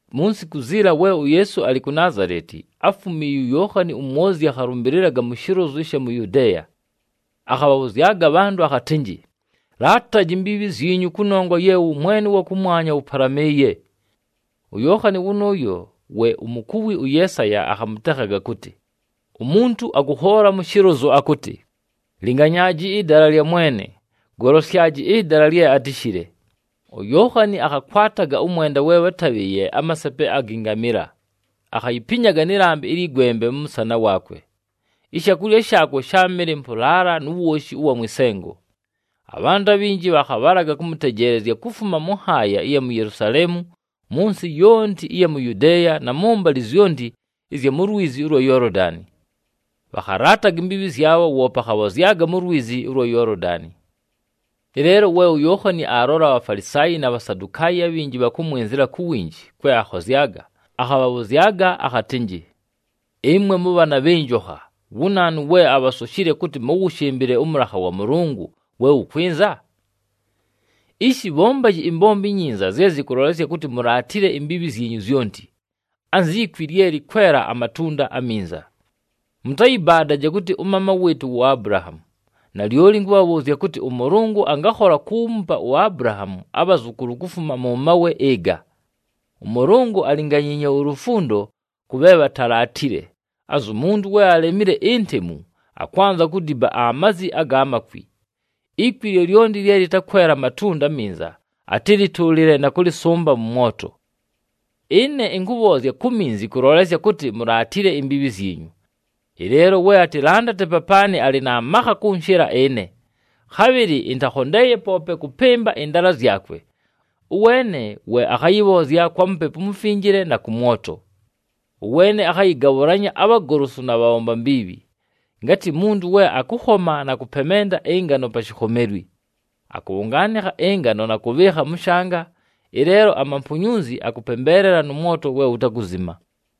Mu nsiku ziila we uYeesu alɨ ku Naazaleti áfumiiye uYookhani uMwozyi akhalʉmbɨlɨlaga mu shilozu ɨsha mu Yudeeya. Akhabhabhʉzyaga abhantʉ akhatɨnjɨ, “Laataji imbiibhi zyinyu, kʉnongwa ye ʉwʉmwene ʉwa kʉmwanya wʉpalamɨɨye!” UYookhani wʉnʉʉyo we umukuwi ʉYeesaya akhamʉtekhaga kʉtɨ, “Umuntu akʉkhoola mu shilozu akʉtɨ, ‘Linganyaaji ɨdala lya Mwene, golosyaji ɨdala lye atɨshɨle.’” UYookhani akhakwataga ʉmwenda we bhátabhɨɨye amasepe agɨ ngamɨla, akhayipinyaga nɨ lambɨ ɨlyɨ gwembe mʉ mʉsana waakwe. Ishaakulya shaakwe sháamɨle mpʉlaala nu wooshi ʉwa mwɨ sengo. Abhantʉ abhinji bhakhabhalaga kʉmʉtejeelezya kufuma mʉ nhaaya ɨya mu Yelusaleemu, mʉ nsɨ yonti ɨya mu Yudeeya na mʉmbalɨ zyonti ɨzya mu lwizi ʉlwa Yoolodani. Bhakhalaataga imbiibhi zyabho, woope akhabhozyaga mu lwizi ʉlwa Yoolodani. Ɨleelo we uYookhani aalola aBhafalisaayi na Bhasadukaayi abhinji bhakʉmwɨnzɨla ku winji kwe akhozyaga, akhabhabhʉzyaga akhatɨnjɨ, “Ɨmwe mʉbhaana bhɨ njokha! Wu naanu we abhasoshile kʉtɨ mʉwʉshɨmbɨle ʉmʉlakha wa Mʉlʉngʉ we wʉkwɨnza? Ishi bhombaji ɨmbombo inyinza zye zɨkʉlolesya kʉtɨ mulaatile imbiibhi zyinyu zyonti, anzi kwi lye lɨkwela amatunda aminza. Mʉtayɨbaadaje kʉtɨ, ‘Ʉmaama wɨɨtʉ wu Abulahaamu!’ Nalyoli ɨnkʉbhabhʉʉzya kʉtɨ, ʉMʉlʉngʉ angakhola kuumupa uAbulahaamu abhazʉkʉlʉ kufuma mʉ mawe ɨga! ɄMʉlʉngʉ alinganyiinye ulufundo kʉ bhe bhatalaatile, anzu muntu we alemile intemu akwanza kudiba amazi aga makwi. Ikwi lyolyonti lye lɨtakwela amatunda aminza, atɨlɨtʉʉlɨle na kʉlɨsʉmba mʉ mwoto. Ɨne ɨnkʉbhoozya ku minzi kʉlolesya kʉtɨ mulaatile imbiibhi zyinyu. Ɨleelo we atɨlandate papaanɨ alɨ na makha kʉnshɨla ɨne. Khabhɨlɨ ɨntakhondeeye poope kʉpɨmba ɨndaala zyakwe. Ʉweene, we akhayɨbhoozya kwa Mupepu uMufinjile na kʉ mwoto. Ʉweene akhayɨbhagabhʉlanya abhagolosu na bhabhomba mbiibhi, ngatɨ muntu we akʉkhoma na kʉpementa ɨngano pa shikhomelwi, akʉbhʉngaanɨkha ɨngano na kʉbhɨɨkha mʉ shanga, ɨleelo amampunyunzi akʉpembeelela nʉ mwoto we wutakuzima.”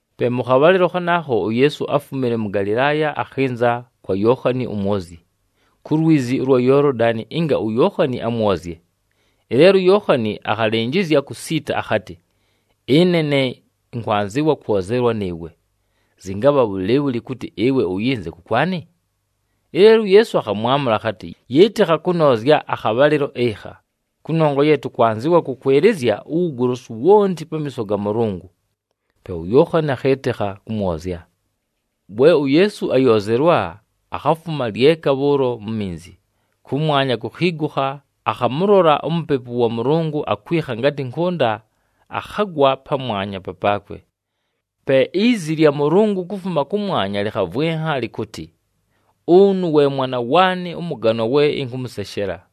Pe mʉ khabhalɨlo khanaakho, uYeesu áfumile mʉ Galɨlaaya, akhɨnza kwa Yookhani uMwozyi, ku lwizi ʉlwa Yoolodani ɨnga uYookhani amwozye. Ɨleelo uYookhani akhalɨnjɨzya kusiita, akhatɨ, “Ɨne ne ɨnkwanzɨwa kwozelwa nɨɨwe, zɨngabha bhʉlɨɨbhʉlɨ kʉtɨ ɨwe ʉyɨnze kʉkwanɨ?” Ɨleelo uYeesu akhamwamʉla akhatɨ, “Yɨɨtɨkha kʉnoozya akhabhalɨlo ɨkha, kʉnongwa ye tʉkwanzɨwa kʉkwɨlɨzya uwugolosu wonti pamiiso ga Mʉlʉngʉ.” Pe uYookhani akhɨɨtɨkha kʉmwozya. We uYeesu ayoozelwa, akhafuma lyeka bhʉʉlo mu minzi, kʉmwanya kukhiigukha, akhamʉlola uMupepu wa Mʉlʉngʉ akwikha ngatɨ nkʉnda, akhagwa pamwanya papaakwe. Pe izi lya Mʉlʉngʉ kufuma kʉmwanya lɨkhavwɨnha lɨkʉtɨ, “Ʉnʉ we Mwana waanɨ ʉmʉganwa, we ɨnkʉmʉseshela.”